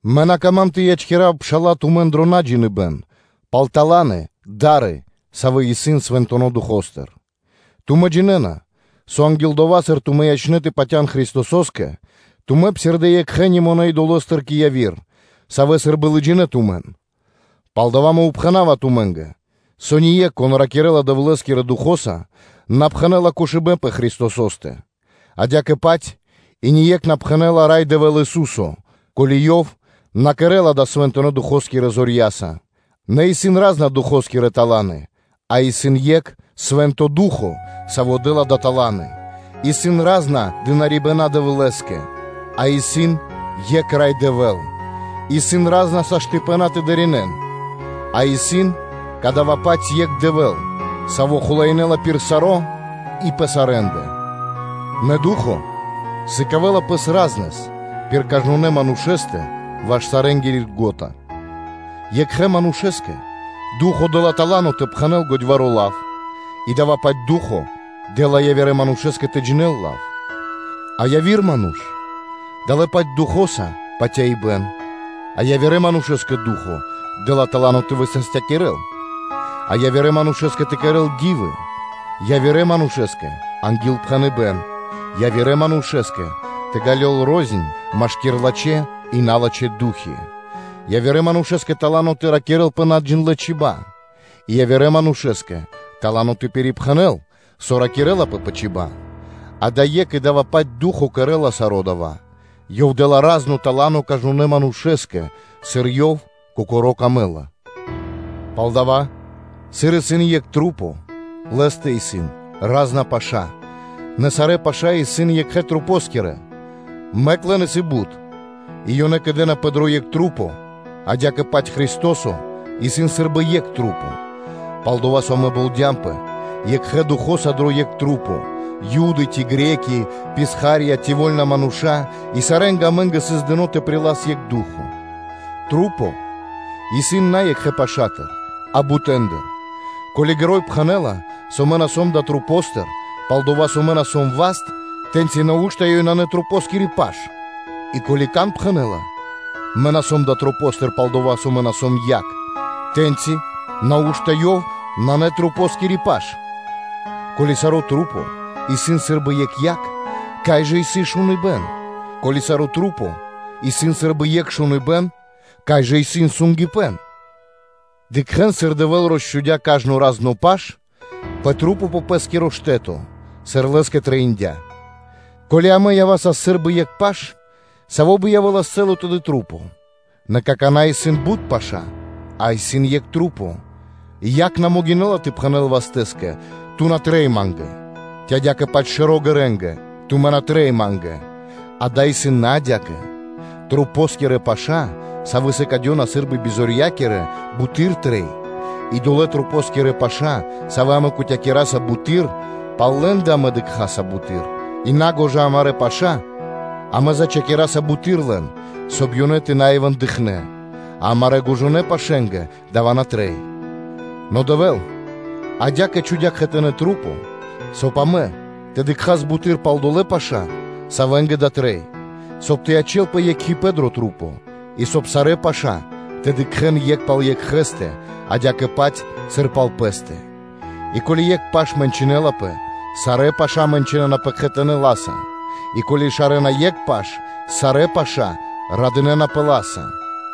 Мэ на кама́м тэ ячкирав, пшала́лэ, тумэн дро наджиныбэн пал таланы, савэ́ исын Свэнтонэ́ Духо́стыр. Тумэ́ джинэ́на, со анги́л дова́, сыр тумэ́ ячнэ́ тэ патя́н Христосо́скэ, тумэ́ псирдэ́ екхэ́ немонэ́ идоло́стыр кэ яви́р, савэ́ сы́рбы лыджинэ́ тумэн. Палдава́ мэ упхэнава тумэ́нгэ, со ние́кх, кон ракирэ́ла Дэвлэ́скирэ Духо́са, на пхэнэ́ла кошыбэ́н пэ Христосо́стэ; адя́кэ-паць и ние́кх на пхэнэ́ла “Рай Дэвэ́л Ису́со”, ко́ли ёв на кэрэ́ла дава́ Свэнтонэ́ Духо́скирэ зорья́са. Нэ исын ра́зна Духо́скирэ таланы (даровании), а исын екх Свэ́нто Ду́хо (Фа́но), Саво́ дэ́ла далэ́ таланы; исын ра́зна служэ́нии (дынарибэна́) Дэвлэ́скэ, а исын екх Рай Дэвэ́л; исын ра́зна саштыпэна (возможности) тэ дынаринэ́н, а исын кадава́-паць екх Дэвэ́л, Саво́ хулаинэла пир саро́ и пэ сарэ́ндэ. Нэ Ду́хо (Фа́но) сыкавэ́ла пэс разнэс пир кажнонэ́ манушэ́стэ ваш сарэнгири льго́та. Екхэ манушэ́скэ Ду́хо (Фа́но) дэ́ла тала́но тэ пхэнэ́л годьваро́ лав, и дава́-паць Ду́хо (Фа́но) дэ́ла явирэ манушэ́скэ тэ джинэ́л лав. А явирэ манушэ́скэ дэ́лапэ далэ́-паць Духо́са патяибэ́н, а явирэ манушэ́скэ Ду́хо (Фа́но) дэ́ла тала́но тэ высастякирэл; а явирэ манушэ́скэ тэ кэрэ́л ди́вы, явирэ-манушэ́скэ тэ ангилпхэнэн, явирэ манушэ́скэ тэ ґалёл рознь машки́р лачхэ́ и налачхэ́ ду́хи, явирэ манушэ́скэ тала́но тэ ракирэ́л пэ наджиндлэ чиба́ (чибья́), и явирэ манушэ́скэ тала́но тэ пирипхэнэл, со ракирлапэ пэ чиба́ (чибья́). Дава́ исын екх и дава́-паць Ду́хо (Фа́но) кэрэ́ла саро́ дава́; Ёв дэ́ла разно тала́но кажнонэ́ манушэ́скэ, сыр Ёв Кокоро́ выкэдэ́ла. Палдава́, сыр исын екх ману́ш, лэ́стэ исын ра́зна паша́, нэ сарэ́ паша́ исын екхэ манушэ́скирэ, мэк лэн исын бут, и ёнэ кэдэнапэ дро екх маса́, – адя́кэ-паць Христо́со исын сы́рбы Екх. Пал-дова́ со амэ болдямпэ екхэ Духо́са дро екх маса́, – Юды ци Гре́ки (Баламэ́), – писха́рья ци вольна мануша́, и сарэ́нгэ амэ́нгэ сыс дыно́ тэ прилас екх Ду́хо (Фа́но). Маса́ исын на екхэ пашатыр (пашэстыр), а бутэндыр. Ко́ли ґэро́й пхэнэ́ла: “Мэ на сом далэ́ масэ́ндыр, пал-дова́ со мэ на сом васт”; тэ́ньчи нау́што ёй нанэ масэнгири паш? И ко́ли кан пхэнэ́ла: “Мэ на сом далэ́ масэ́ндыр, пал-дова́ со мэ на сом якх”, тэ́ньчи, нау́што ёв нанэ масэнгири паш? Ко́ли сарэ́ маса́ исын сы́рбы екх якх, кай жа исын шуныбэ́н? Ко́ли сарэ́ маса́ исын сы́рбы екх шуныбэ́н, кай жа исын сунгипэн (обоняниё)? Дыкхэ́н, сыр Дэвэ́л росчхудя́ кажно разно паш пэ маса́ пэ пэ́скиро штэ́то, сыр Лэ́скэ трэиндя́. Ко́ли амэ явасас сы́рбы екх паш, савэ́ бы явэ́лас цэ́ла тэды маса́? Нэ какана́ исын бут паша́, а исын екх мануша́. Якх на могинэ́ла тэ пхэнэ́л вастэскэ: “Ту на трэй ма́нгэ”; ци адя́кэ-паць шэро́ ґэрэнгэ: “Тумэ́ на трэй ма́нгэ.” Дава́ исын на адя́кэ: масэнгирэ паша́, савэ́ сыкадёна сы́рбы бизорья́кирэ, буты́р трэй; и долэ́ масэнгири паша́, савэ́ амэ кутякираса буты́р, пал лэ́ндэ амэ дыкхаса буты́р; и на́гожа амарэ́ паша́ амэ зачхакираса буты́р лэн, соб (кай) ёнэ тэ на явэ́н бицялэ; а амарэ́ гожонэ пашэнгэ дава́ на трэй. Но Дэвэ́л адя́кэ чхудя́ кхэтанэ́ маса́, соб (кай) амэ тэ дыкхас буты́р пал долэ́ паша́, савэ́нгэ дава́ трэй; соб (кай) тэ ячэ́лпэ екхипэ́н дрэ маса́, и, соб (кай) сарэ́ паша́ тэ дыкхэ́н екх пал екхэ́стэ, адя́кэ-паць, сыр пал пэ́стэ. И ко́ли екх паш мэнчынэлапэ, сарэ́ паша́ мэнчынэнапэ кхэтанэ́ ла́са; и ко́ли шарэна екх паш, сарэ́ паша́ радынэ́напэ ла́са.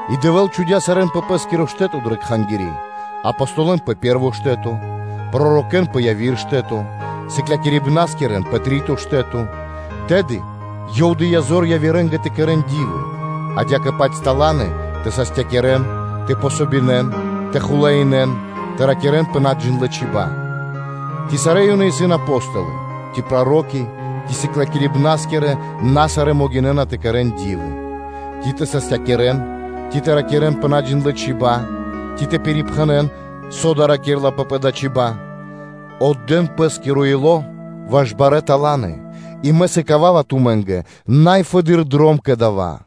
И Дэвэ́л чхудя́ сарэ́н пэ пэ́скиро штэ́то дрэ кхангири́: Апостолэн пэ пэ́рво штэ́то, пророкэ́н пэ яви́р штэ́то, сыклякирибнаскирэн пэ три́то штэ́то; тэды Ёв дыя́ зор явирэ́нгэ тэ кэрэ́н ди́вы; адя́кэ-паць таланы тэ састякирэн, тэ помогинэн; тэ хулаинэн; тэ ракирэ́н пэ наджиндлэ чиба́ (чибья́). Ци сарэ́ ёнэ исын апостолы, ци проро́ки, ци сыклякирибнаскирэ на сарэ́ могинэ́на тэ кэрэ́н ди́вы; ци тэ састякирэн, ци тэ ракирэ́н пэ наджиндлэ чиба́ (чибья́), ци тэ пирипхэнэн, со дава́ ракирлапэ пэ далэ́ чиба́ (чибья́)? Отдэ́н пэ́скиро ило́ ваш барэ́ таланы, и мэ сыкава́ва тумэ́нгэ най фэдыдыр дром кэ дава́.